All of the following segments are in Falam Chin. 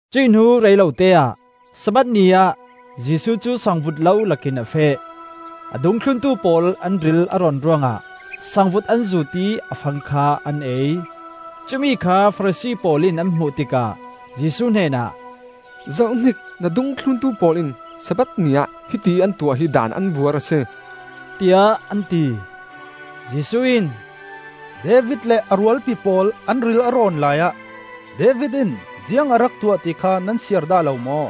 Cuih hnu reilote-ah Sabbath ni ah Jesuh cu sangvut lo lakin a feh. A dungthluntu pawl an ril a rawn ruangah sangvut an zuut ih a fang kha an ei. Cumi kha Farasi pawl in an hmuh tikah Jesuh hnenah, “Zohhnik, na dungthluntu pawl in Sabbath ni ah hiti ih an tuah hi Daan an buar a si,” tiah an ti. Jesuh in, “David le a rualpi pawl an ril a rawn laiah David in ziang a rak tuah ti kha nan siar dah lo maw?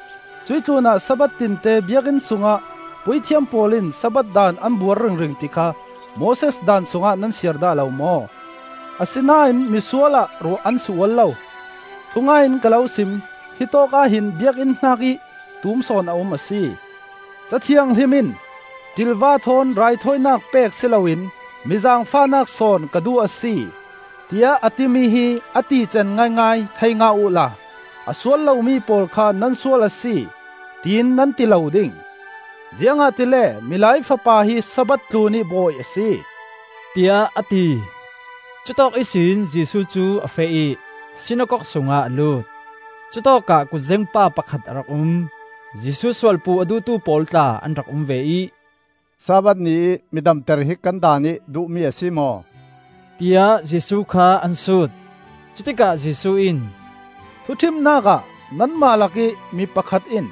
Cuih tlunah Sabbath tinte Biakinn sungah puithiam pawl in Sabbath daan an buar ringring ti kha Moses Daan sungah nan siar dah lo maw? Asinain mi sual ah ruah an si ual lo. Thungai in ka lo sim: hitawk ah hin Biakinn hnakih tum sawn a um a si. Ca Thianghlim in, ‘ṭilva thawn raithawinak pek si loin mi zaangfahnak sawn ka duh a si,’ tiah a timi hi a tican ngaingai thei ngah uhla a sual lomi pawl kha nan sual a si, tiin nan ti lo ding. Ziangahtile Milai Fapa hi Sabbath tlunih Bawi a si,” tiah a ti. Cutawk ihsin Jesuh cu a feh ih sinakok sungah a lut. Cutawkah kutzeng pa pakhat a rak um. Jesuh sualpuh a duhtu pawl tla an rak um ve ih, “Sabbath ni ih mi damter hi kan Daan ih duhmi a si maw?” tiah Jesuh kha an sut. Cutikah Jesuh in, “Thuṭhimnak ah nanmah lakih mi pakhat in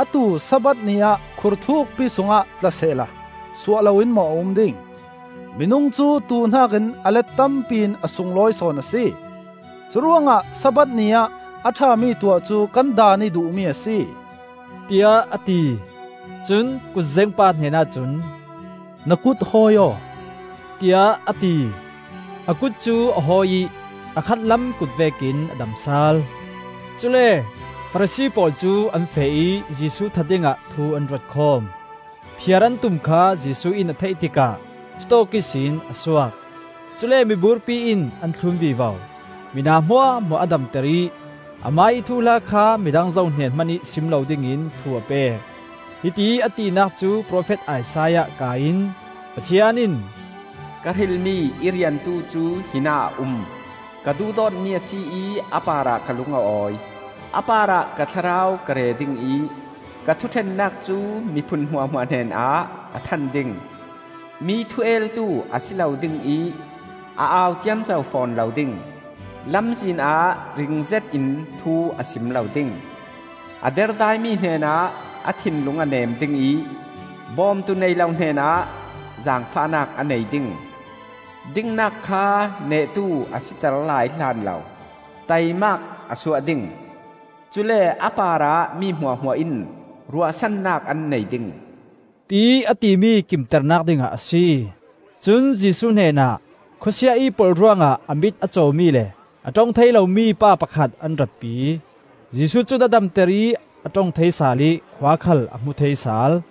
a tuu Sabbath ni ah khur thukpi sungah tla sehla suah loin maw a um ding? Minung cu tuu hnakin a let tampi in a sunglawi sawn a si. Curuangah Sabbath ni ah a ṭhami tuah cu kan Daan ih duhmi a si,” tiah a ti. Cun kutzeng pa hnenah cun, “Na kut hawi aw,” tiah a ti. A kut cu a hawi ih a khatlam kut vekin a dam sal. Cule Farasi pawl cu an feh ih Jesuh that dingah thu an ruat khawm. Phiar an tum kha Jesuh in a theih tikah cutawk ihsin a suak. Cule miburpi in an thlun vivo. Mina hmuahhmuah a damter ih, amah ih thuhla kha midang zo hnen hmanih sim lo dingin thu a pek. Hitiih a tinak cu profet Isaiah kaa in Pathian in: “Ka hrilmi i riantu cu hinah a um; Ka duhdawtmi a si ih a parah ka lung a awi. A parah ka Thlarau ka re ding ih, Ka thuṭhennak cu miphun hmuah hmuah hnenah a than ding. Mi thu eltu a si lo ding ih a au ciamco fawn lo ding. Lamzin ah ring zetin thu a sim lo ding. A derdaimi hnenah a thinlung a nem ding ih, Bawmtu nei lo hnenah zaangfahnak a nei ding. Dingnak kha nehtu a siter lai hlan lo taimak a suah ding. Cule a parah mi hmuahhmuah in ruahsannak an nei ding,” tiih a timi kimternak dingah a si. Cun Jesuh hnenah khawsia ih polh ruangah a mit a cawmi le a ṭong thei lomi pa pakhat an ratpi. Jesuh cun a damter ih a ṭong thei sal ih khua khal a hmu thei sal.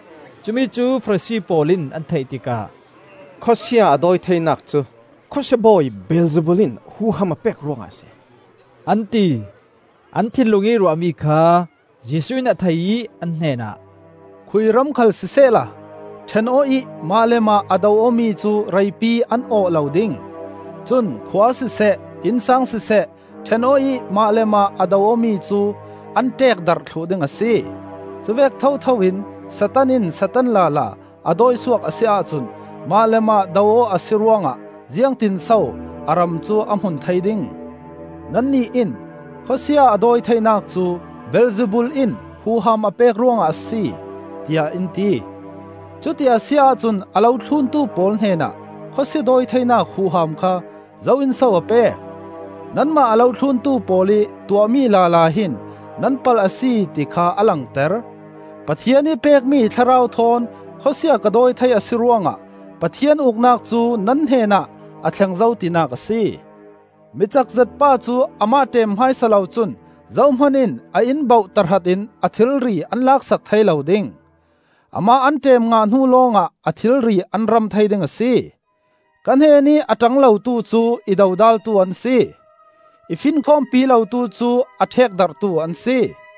Cumi cu Farasi pawl in an theih tikah, “Khawsia a dawi theinak cu khawsia bawi Beelzebul in huham a pek ruangah a si,” an ti. An thinlung ih ruahmi kha Jesuh in a thei ih an hnenah, “Khui ram khal sisehla ṭhen aw ih mah le mah a do awmi cu reipi an awh lo ding. Cun khua siseh, innsang siseh, ṭhen aw ih mah le mah a do awmi cu an ṭeekdarh thluh ding a si. Cuvek thotho in Satan in Satan lala a dawisuak a si ahcun mah le mah do aw a si ruangah ziangtinso a ram cu a hmun thei ding? Nannih in, ‘Khawsia a dawi theinak cu Beelzebul in huham a pek ruangah a si,’ tiah in ti. Cuti a si ahcun a lo thluntu pawl hnenah khawsia dawi theinak huham kha zo in so a pek? Nanmah a lo thluntu pawl ih tuahmi lala hin nan palh a si ti kha a langter. Pathian ih pekmi Thlarau thawn khawsia ka dawi thei a si ruangah Pathian Uknak cu nan hnenah a thleng zo tinak a si. “Mi cakzet pa cu amah ṭem hmaisa lo cun zohman in a inn bauh tahrat in a thilri an laksak thei lo ding. Amah an ṭem ngah hnu lawngah a thilri an ram thei ding a si. “Ka hnenih a ṭang lotu cu i dodaltu an si. I finkhawmpi lotu cu a ṭhekdarhtu an si.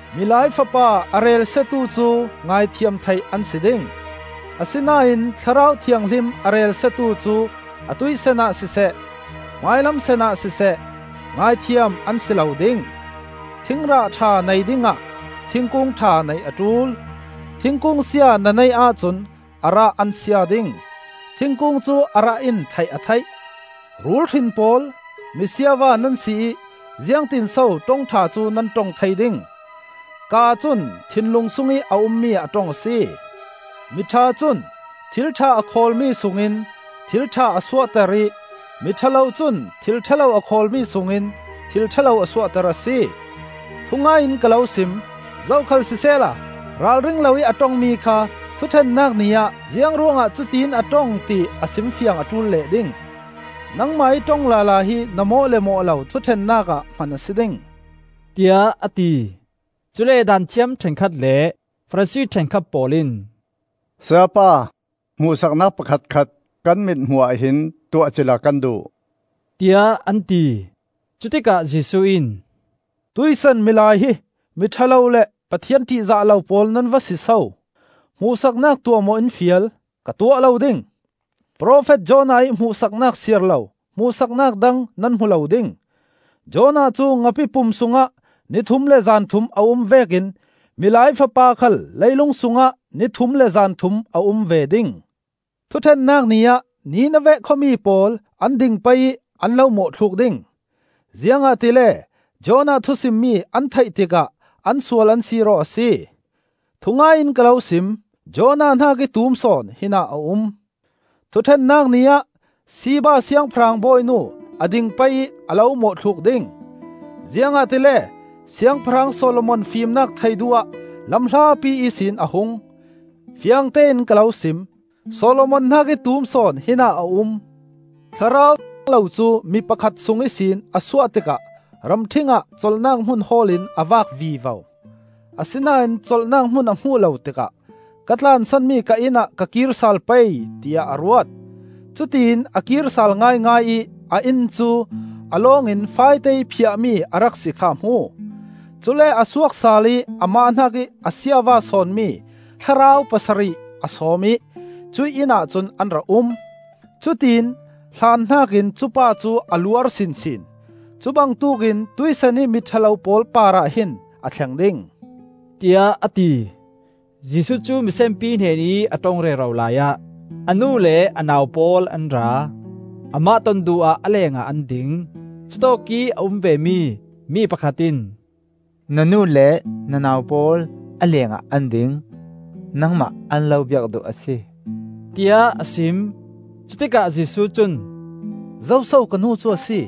Milai Fapa a relsiatu cu ngaithiam theih an si ding. Asinain Thlarau Thianghlim a relsiatu cu atuih sanah siseh, hmailam sanah siseh, ngaithiam an si lo ding. “Thingrah ṭha nei dingah thingkung ṭha neih a ṭul. Thingkung sia na neih ahcun a rah an sia ding. Thingkung cu a rah in theih a theih. Rul hrin pawl! Mi siava nan si ih ziangtinso ṭong ṭha cu nan ṭong thei ding? Kaa cun thinlung sungih a ummi a ṭong a si. Mi ṭha cun thil ṭha a khawlmi sungin thil ṭha a suahter ih mi ṭha lo cun thil ṭha lo a khawlmi sungin thil ṭha lo a suahter a si. “Thungai in ka lo sim: zokhal sisehla ralring loih a ṭongmi kha Thuṭhennak Ni ah ziang ruangah cutiin a ṭong ti a simfiang a ṭul leh ding. Nangmah ih ṭong lala hi na mawh le mawh lo thuṭhennak ah hman a si ding,” tiah a ti. Cule Daanthiam ṭhenkhat le Farasi ṭhenkhat pawl in, “Sayapa, hmuhsaknak pakhatkhat kan mit hmuh ahhin tuah cila kan duh,” tiah an ti. Cutikah Jesuh in, “Tuih san milai hi mi ṭha lo le Pathian ṭihzah lo pawl nan va si so! Hmuhsaknak tuah maw in fial? Ka tuah lo ding. Profet Jonah ih hmuhsaknak siar lo hmuhsaknak dang nan hmu lo ding. Jonah cu ngapi pum sungah ni thum le zan thum a um vekin Milai Fapa khal leilung sungah ni thum le zan thum a um ve ding. Thuṭhennak Ni ah Nineveh khuami pawl an ding pei ih an lo mawhthluk ding, ziangahtile Jonah thusimmi an theih tikah an sual an sir aw a si. Thungai in ka lo sim: Jonah hnakih tum sawn hinah a um. Thuṭhennak Ni ah Sheba Siangpahrang bawinu a ding pei ih a lo mawhthluk ding, ziangahtile Siangpahrang Solomon fimnak theih duh ah lam hlapi ihsin a hung. Fiangtein ka lo sim: Solomon hnakih tum sawn hinah a um. “Thlarau thiang lo cu mi pakhat sung ihsin a suah tikah ramṭhing ah colhnak hmun hawl in a vak vivo. Asinain colhnak hmun a hmuh lo tikah, ‘Ka tlansan mi ka inn ah ka kir sal pei,’ tiah a ruat. Cutiin a kir sal ngaingai ih a inn cu a lawngin faite ih phiahmi a rak si kha a hmu. Cule a suak sal ih amah hnakih a siava sawnmi thlarau pasarih a sawm ih cuih inn ahcun an ra um; cutiin a hlan hnakin cupa cu a luar sinsin. Cu bangtuk in tuihsan mi ṭha lo pawl parah hin a thleng ding,” tiah a ti. Jesuh cu misenpi hnenih a ṭong rero laiah a nu le a nau pawl an ra. Amah ton duh ah a lengah an ding. Cutawkih a um vemi mi pakhat in, “Na nu le na nau pawl a lengah an ding, nangmah an lo biak duh a si,” tiah a sim. Cutikah Jesuh cun, “Zoso ka nu cu a si?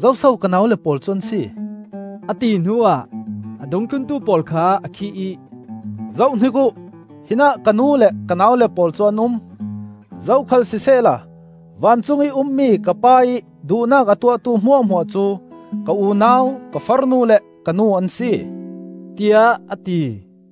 Zoso ka naule pawl cu an si?” a ti hnuah, a Dungthluntu pawl kha a khih ih, “Zohhnik uh! Hinah ka nu le ka naule pawl cu an um. Zokhal sisehla vancungih a ummi ka Pa ih duhnak a tuahtu hmuahhmuah cu ka unau, ka farnu le ka nu an si,” tiah a ti.